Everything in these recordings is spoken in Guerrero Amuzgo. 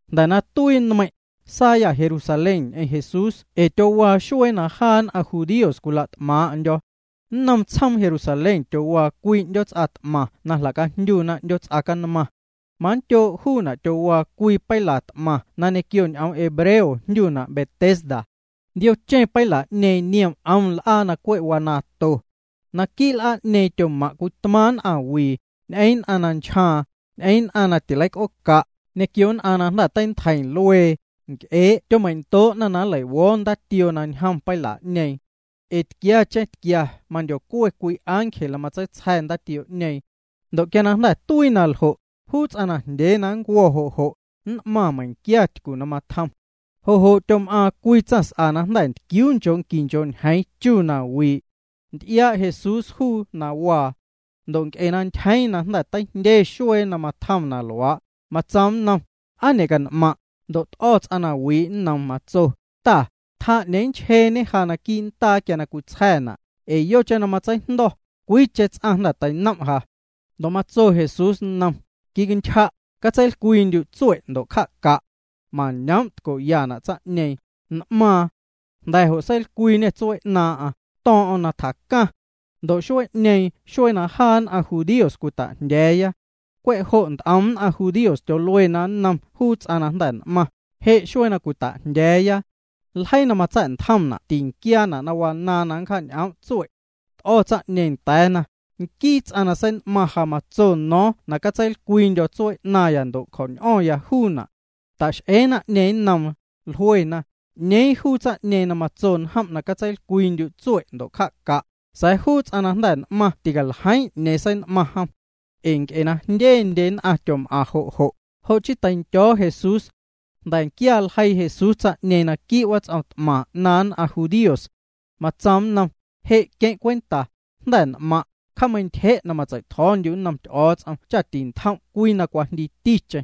Jnda̱ na tuii nmeiⁿ', saayâ Jerusalén ñ'eⁿ Jesús ee tyowaa xuee na jaa nn'aⁿ judíos cwila't'maaⁿ'ndyo̱. Nnom tsjoom Jerusalén tyowaa cwii 'ndyoots'a t'maⁿ na jla'cajndyuna 'Ndyoots'a Canmaⁿ. Manndyoo' juuna' tyowaa cwii peila t'maⁿ na ñequio ñ'oom hebreo jndyuna' Betesda. Ndiocheⁿ peila'ñeeⁿ niom 'om l'aa na cwe' wanaaⁿto. Naquii' l'aa'ñeeⁿ tyomaⁿ' cwii tmaaⁿ' nn'aⁿwii, ñ'eⁿ nn'aⁿ na nchjaaⁿ, ñ'eⁿ nn'aⁿ na tileic'ooca', ñequio nn'aⁿ na jnda̱ teintjeiⁿ luee, nc'ee'. Tyomeindoo'na na nleiwo̱o̱ ndaatioo na ñjom peila'ñeeⁿ. Ee tquiacheⁿ tquia mandyocue cwii ángel na matseitsja̱ ndaatioo'ñeeⁿ. Ndo' quia na jnda̱ tuii na ljo', juu ts'aⁿ najndyee na nncuo̱ jo' jo', nn'maⁿ meiⁿquia tycu na matjom. Jo' jo' tyom'aaⁿ cwii tsaⁿs'a na jnda̱ ntquiuu nchoo' quii nchoo' ñeeⁿ chu na wii'. Nty'iaa' Jesús juu na waa. Ndo' nc'e na ntyjeeⁿ na jnda̱ teijndye xuee na matjom na luaa', matsoom nnom: —¿Aa ñe'can'maⁿ'? Ndo' t'o̱ ts'aⁿ na wii' nnoom. Matso: —Ta, tjaa 'ñeeⁿ nnchjeeñe ja quii' ndaa quia na cwitsja̱na', ee yocheⁿ na matseijndo̱, cwiicheⁿ ts'aⁿ jnda̱ teinom' ja. Ndo' matso Jesús nnom: —Quicantyja', catseilcwiindyu' tsue' ndo' cja'ca'. Mañoom' tco'yana' tsaⁿ'ñeeⁿ, n'maaⁿ. Jnda̱ jo' seilcwiiñê tsuee 'naaⁿ'aⁿ, to̱o̱ⁿ'o̱ⁿ na tjacaⁿ. Ndo' xuee'ñeeⁿ xuee na jaa nn'aⁿ judíos cwita'jndya̱a̱ya. Cwe' jo' nt'om nn'aⁿ judíos tyoluena nnom juu ts'aⁿ na jnda̱ n'maⁿ: —Je' xuee na cwita'jndya̱a̱ya. Ljeii na matsa̱'ntjomna' tinquiaana' na wanaaⁿ na nncja'ñ'oom' tsue'. T'o̱ tsaⁿ'ñeeⁿ nda̱a̱na: —Nquii ts'aⁿ na sein'maⁿ ja matso no̱o̱ⁿ na catseilcwiindyo̱ tsuee 'naⁿya ndo' cjo̱ñ'o̱ⁿya juuna'. Ta'x'ee naⁿ'ñeeⁿ nnoom, jluena: —¿'Ñeeⁿ juu tsaⁿ'ñeeⁿ na matso njom' na catseilcwiindyu' tsue' ndo' cja'ca'? Sa̱a̱ juu ts'aⁿ na jnda̱ n'maⁿ ticaljeiiⁿ 'ñeeⁿ sein'maⁿ jom. Ee nc'e jndye nn'aⁿ tyom'aⁿ jo' jo', jo' chii teindyo̱o̱ Jesús. Jnda̱nquia ljeii Jesús tsaⁿ'ñeeⁿ naquii' wats'om t'maⁿ 'naaⁿ nn'aⁿ judíos. Matsoom nnom: —Je' queⁿ' cwenta, jnda̱ n'maⁿ', cja'meintyje' na matsei'tjo̱o̱ndyu' nnom Ty'o̱o̱ts'om cha tintjom' cwii na cwajndiiticheⁿ.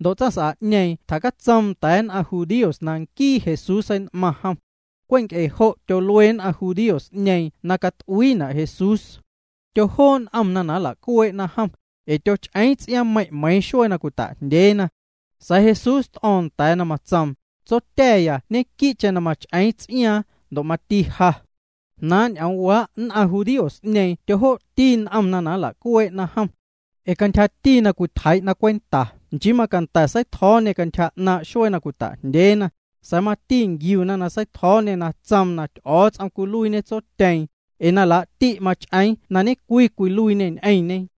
Ndo' tsaⁿs'a'ñeeⁿ tjacatsoom nda̱a̱ nn'aⁿ judíos na nquii Jesús sein'maⁿ jom. Cwe' nc'e jo' tyol'uee nn'aⁿ judíos'ñeeⁿ na cat'uiina' Jesús. Tyojoo' n'omna na nla'cuee'na jom, ee tyoch'eeⁿ ts'iaaⁿmeiⁿ' meiiⁿ xuee na cwita'jndyeena. Sa̱a̱ Jesús t'o̱o̱ⁿ nda̱a̱na, tsoom: —Tsotya̱ya ñequii'cheⁿ mach'eeⁿ ts'iaaⁿ, ndo' mati ja. Jnaaⁿ' ñ'oomwaa' nn'aⁿ judíos'ñeeⁿ tyojoo'ti n'omna na nla'cuee'na jom. Ee cantyja na cwitjeii'na cwenta nchii macanda̱ na seitjo̱o̱ñê cantyja 'naaⁿ' xuee na cwita'jndyeena, sa̱a̱ mati nquiuna na seitjo̱o̱ñê na tsoom na Ty'o̱o̱ts'om cwiluiiñe Tsotyeeⁿ, ee na laa'ti' mach'eeⁿ na ñe'cwii cwiluiiñê ñ'eⁿñe.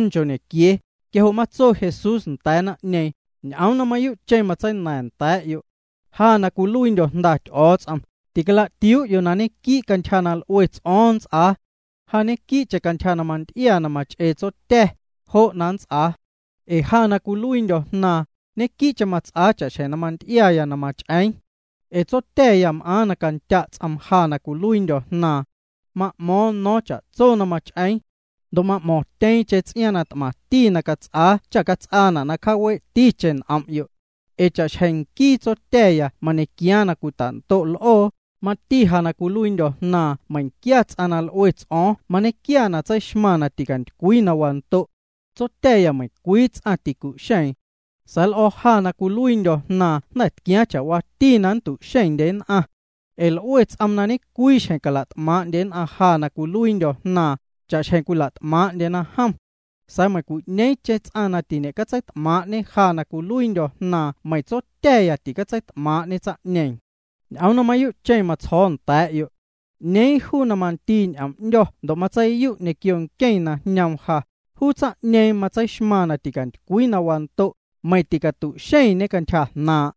Quia jo' matso Jesús nda̱a̱ naⁿ'ñeeⁿ: —Ñ'oom na mayuu'cheⁿ matseina̱ⁿya nda̱a̱'yo'. Ja na cwiluiindyo̱ Jnda Ty'o̱o̱ts'om, ticalatiuu'yo' na ñequii' cantyja na l'ue ts'o̱o̱ⁿ nnts'aa. Ja ñequii'cheⁿ cantyja na manty'ia na mach'ee Tsotya̱, jo' na mats'aa. Ee ja na cwiluiindyo̱ Jnaaⁿ, ñequii'cheⁿ mats'aa cha'xjeⁿ na manty'iaya na mach'eeⁿ. Ee Tsotya̱ya m'aaⁿ na candya' ts'oom ja na cwiluiindyo̱ Jnaaⁿ. Ma'mo̱o̱ⁿ no̱o̱ⁿ cha'tso na mach'eeⁿ. Ndo' m'mo̱ⁿtyeeⁿcheⁿ ts'iaaⁿ na t'maⁿti na cats'aa cha cats'aana' na cjaawee'ticheⁿ n'om'yo'. Ee cha'xjeⁿ nquii Tsotya̱ya mañequiaaⁿ na cwitando' l'oo, mati ja na cwiluiindyo̱ Jnaaⁿ meiⁿquia ts'aⁿ na l'ue ts'o̱o̱ⁿ mañequia na tseixmaⁿ na ticantycwii na wando'. Tsotya̱ya meiⁿcwii ts'aⁿ ticu'xeeⁿ. Sa̱a̱ l'o̱o̱ ja na cwiluiindyo̱ Jnaaⁿ jnda̱ tquiaaⁿ cha'waati na nntu'xeⁿndye nn'aⁿ. Ee l'ue ts'oom na ñecwii xjeⁿ cala't'maaⁿ'ndye nn'aⁿ ja na cwiluiindyo̱ Jnaaⁿ, cha'xjeⁿ cwila't'maaⁿ'ndyena jom. Sa̱a̱ meiⁿcwi'ñeeⁿcheⁿ ts'aⁿ na tiñe'catseit'maaⁿ'ñe ja na cwiluiindyo̱ Jnaaⁿ meiⁿ Tsotya̱ya ticatseit'maaⁿ'ñe tsaⁿ'ñeeⁿ. ’Ñ'oom na mayuu'cheⁿ matsjo̱o̱ nda̱a̱'yo'. 'Ñeeⁿ juu na mandii ñ'oom 'ndyo̱ ndo' matseiyu' ñequio nqueⁿ na jñoom ja, juu tsaⁿ'ñeeⁿ matseixmaⁿ na ticantycwii na wando', meiⁿ ticatu'xeⁿñe cantyja jnaaⁿ'.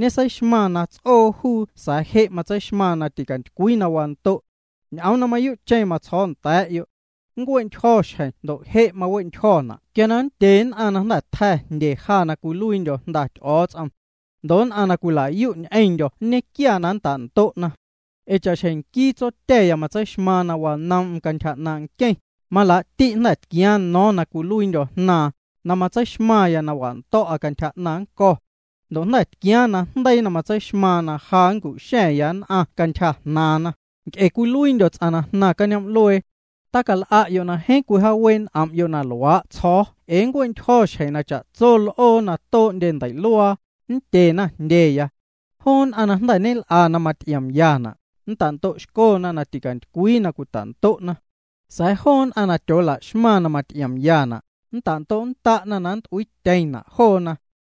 Ñeseixmaⁿ na ts'oo juu sa̱a̱ je' matseixmaⁿ na ticantycwii na wando'. Ñ'oom na mayuu'cheⁿ matsjo̱o̱ nda̱a̱'yo'. Nncue'ntyjo̱ xjeⁿ ndo' je' mawe'ntyjo̱na' quia na nndye nn'aⁿ na jnda̱ tja̱ jndye ja na cwiluiindyo̱ Jnda Ty'o̱o̱ts'om. Ndo' nn'aⁿ na cwila'yu' ñ'eⁿndyo̱ nñequia na nnta'ndo'na. Ee cha'xjeⁿ nquii Tsotya̱ya matseixmaaⁿ na wanoom'm cantyja 'naaⁿ' nqueⁿ, malaa'ti' jnda̱ tquiaaⁿ no̱o̱ⁿ na cwiluiindyo̱ Jnaaⁿ, na matseixmaⁿya na wando̱'a cantyja 'naⁿ nnco̱. Ndo' jnda̱ tquiaaⁿ najndeii na matseixmaaⁿ na ja nncu'xa̱ⁿ nn'aⁿ cantyja jnaaⁿna, nc'e cwiluiindyo̱ ts'aⁿ na jnaⁿ cañoom'luee. Tacal'a'yo' na jeeⁿ cwijaawee' n'om'yo' na luaa' tsjo̱o̱ ee nncue'ntyjo̱ xjeⁿ na cha'tso l'oo na too'ndye ndei'luaa, nndyena jndyeya. Joo nn'aⁿ na jnda̱ ñel'a na maty'iomyana', nntando'xcona na ticantycwii na cwita'ndo'na. Sa̱a̱ joo nn'aⁿ na tyoolaxmaⁿ na maty'iomyana', nntando'nnda'na na nnt'uiityeⁿna' joona.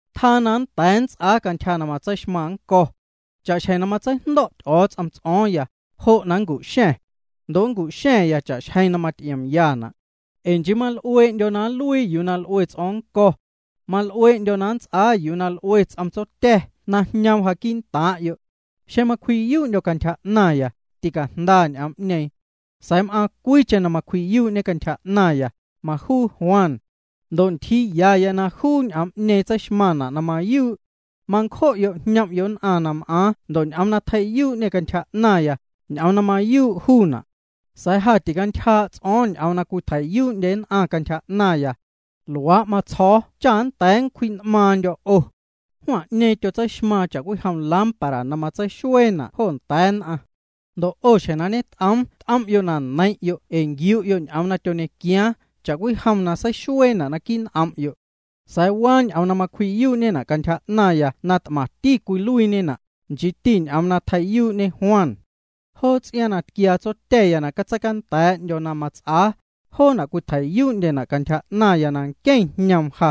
’Tjaa na nnda̱a̱ nnts'aa cantyja na matseixmaⁿ nnco̱. Cha'xjeⁿ na matseijndo̱' Ty'o̱o̱ts'om ts'o̱o̱ⁿya, jo' na macu'xa̱ⁿ. Ndo' macu'xa̱ⁿya cha'xjeⁿ na maty'iomyana'. Ee nchii mal'uee'ndyo̱ na nluii yuu na l'ue ts'o̱o̱ⁿ nnco̱. Mal'uee'ndyo̱ na nnts'aa yuu na l'ue ts'om Tsotya̱ na jñom ja quii'ntaaⁿ'yo'. Xeⁿ macwji'yuu'ndyo̱ cantyja 'naⁿya, ticajnda ñ'oom'ñeeⁿ. Sa̱a̱ m'aaⁿ cwiicheⁿ na macwji'yuu'ñe cantyja 'naⁿya, majuu Juan. Ndo' ntyjiiyaya na juu ñ'oom'ñeeⁿ tseixmaⁿna' na mayuu'. Mancjo'yo' jñom'yo' nn'aⁿ na m'aaⁿ ndo' ñ'oom na tjei'yuu'ñê cantyja 'naⁿya, ñ'oom na mayuu' juuna'. Sa̱a̱ ja ticantyjaa' ts'o̱o̱ⁿ ñ'oom na cwitjei'yuu'ndye nn'aⁿ cantyja 'naⁿya. Luaa' matsjo̱o̱ cha nnda̱a̱ nncwji'n'maaⁿndyo̱ 'o. Juan'ñeeⁿ tyoseixmaaⁿ cha'cwijom lámpara na matseixueena' jo nda̱a̱ nn'aⁿ. Ndo' 'o xjeⁿ na ñet'oom t'om'yo' na neiⁿ'yo' ee nquiu'yo' ñ'oom na tyoñequiaaⁿ cha'cwijom seixueeñena' naquii' n'om'yo'. Sa̱a̱ waa ñ'oom na macwji'yuu'ñena' cantyja 'naⁿya na t'maⁿti cwiluiiñena', nchiiti ñ'oom na tjei'yuu'ñe Juan. Joo ts'iaaⁿ na tquiaa Tsotya̱ya na catseicanda̱a̱'ndyo̱ na mats'aa, joona' cwitjei'yuu'ndyena' cantyja 'naⁿya na nqueⁿ jñoom ja.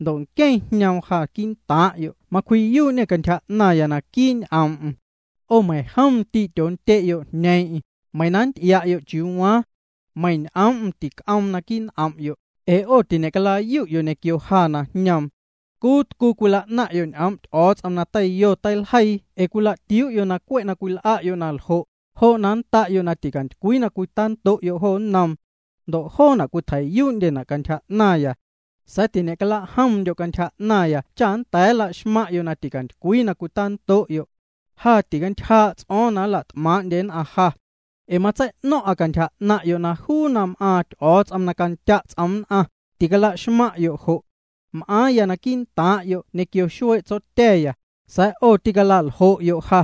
Ndo' nqueⁿ na jñoom ja quii'ntaaⁿ'yo' macwji'yuu'ñê cantyja 'naⁿya naquii' ñ'oom'm. 'O meiⁿjom ndii' tyoondye'yo' jñeeⁿ'eⁿ, meiⁿ na nnty'ia'yo' chiuu waaⁿ. Meiⁿ ñ'oom'm tic'oomna' naquii' n'om'yo', ee 'o tiñe'cala'yu'yo' ñequio ja na jñoom. Tcuu tcuu cwila'naⁿ'yo' ñ'oom' Ty'o̱o̱ts'om na teiljeii teiyo ee cwila'tiuu'yo' cwe' na cwil'a'yo' na ljo', jo' na nnda'yo' na ticantycwii na cwitando'yo' jo nnoom. Ndo' joona' cwitjei'yuu'ndyena' cantyja 'naⁿya. Sa̱a̱ tiñe'cala'jomndyo' cantyja 'naⁿya cha nnda̱a̱ nlaxmaⁿ'yo' na ticantycwii na cwitando'yo'. ’Ja ticantyjaa' ts'o̱o̱ⁿ na nla't'maaⁿ'ndye nn'aⁿ ja. Ee matsei'no̱ⁿ'a cantyja 'naⁿ'yo' na juu na m'aaⁿ Ty'o̱o̱ts'om na candya' ts'oom nn'aⁿ, ticala'xmaⁿ'yo' jo'. M'aaⁿya quii'ntaaⁿ'yo' ñequio xuee' Tsotya̱ya, sa̱a̱ 'o ticala'ljo'yo' ja.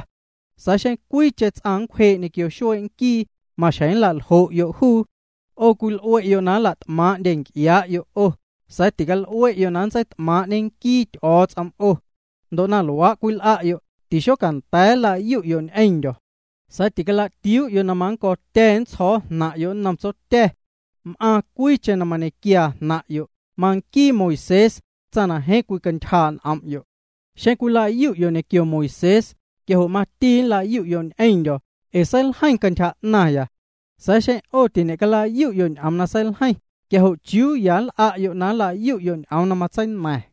Sa̱a̱ xeⁿ cwiicheⁿ ts'aⁿ nncwjee' ñequio xuee' nquii, maxjeⁿ nla'ljo'yo' juu. 'O cwil'ue'yo' na nla't'maaⁿ'ndye nc'ia'yo' 'o, sa̱a̱ tical'ue'yo' na ntseit'maaⁿ'ñe nquii Ty'o̱o̱ts'om 'o. Ndo' na luaa' cwil'a'yo', tixocanda̱a̱ nla'yu'yo' ñ'eⁿndyo̱. Sa̱a̱ ticala'tiuu'yo' na mannco̱tya̱ nntsjo̱o̱ jnaⁿ'yo' nnom Tsotya̱. M'aaⁿ cwiicheⁿ na mañequiaa jnaⁿ'yo', manquiiti Moisés, tsaⁿ na jeeⁿ cwicantyjaa' n'om'yo'. Xeⁿ cwila'yu'yo' ñequio Moisés, quia jo' mati nla'yu'yo' ñ'eⁿndyo̱, ee seiljeiⁿ cantyja 'naⁿya. Sa̱a̱ xeⁿ 'o tiñe'cala'yu'yo' ñ'oom na seiljeiⁿ, quia jo' ¿chiuu ya nl'a'yo' na nla'yu'yo' ñ'oom na matseina̱ⁿ?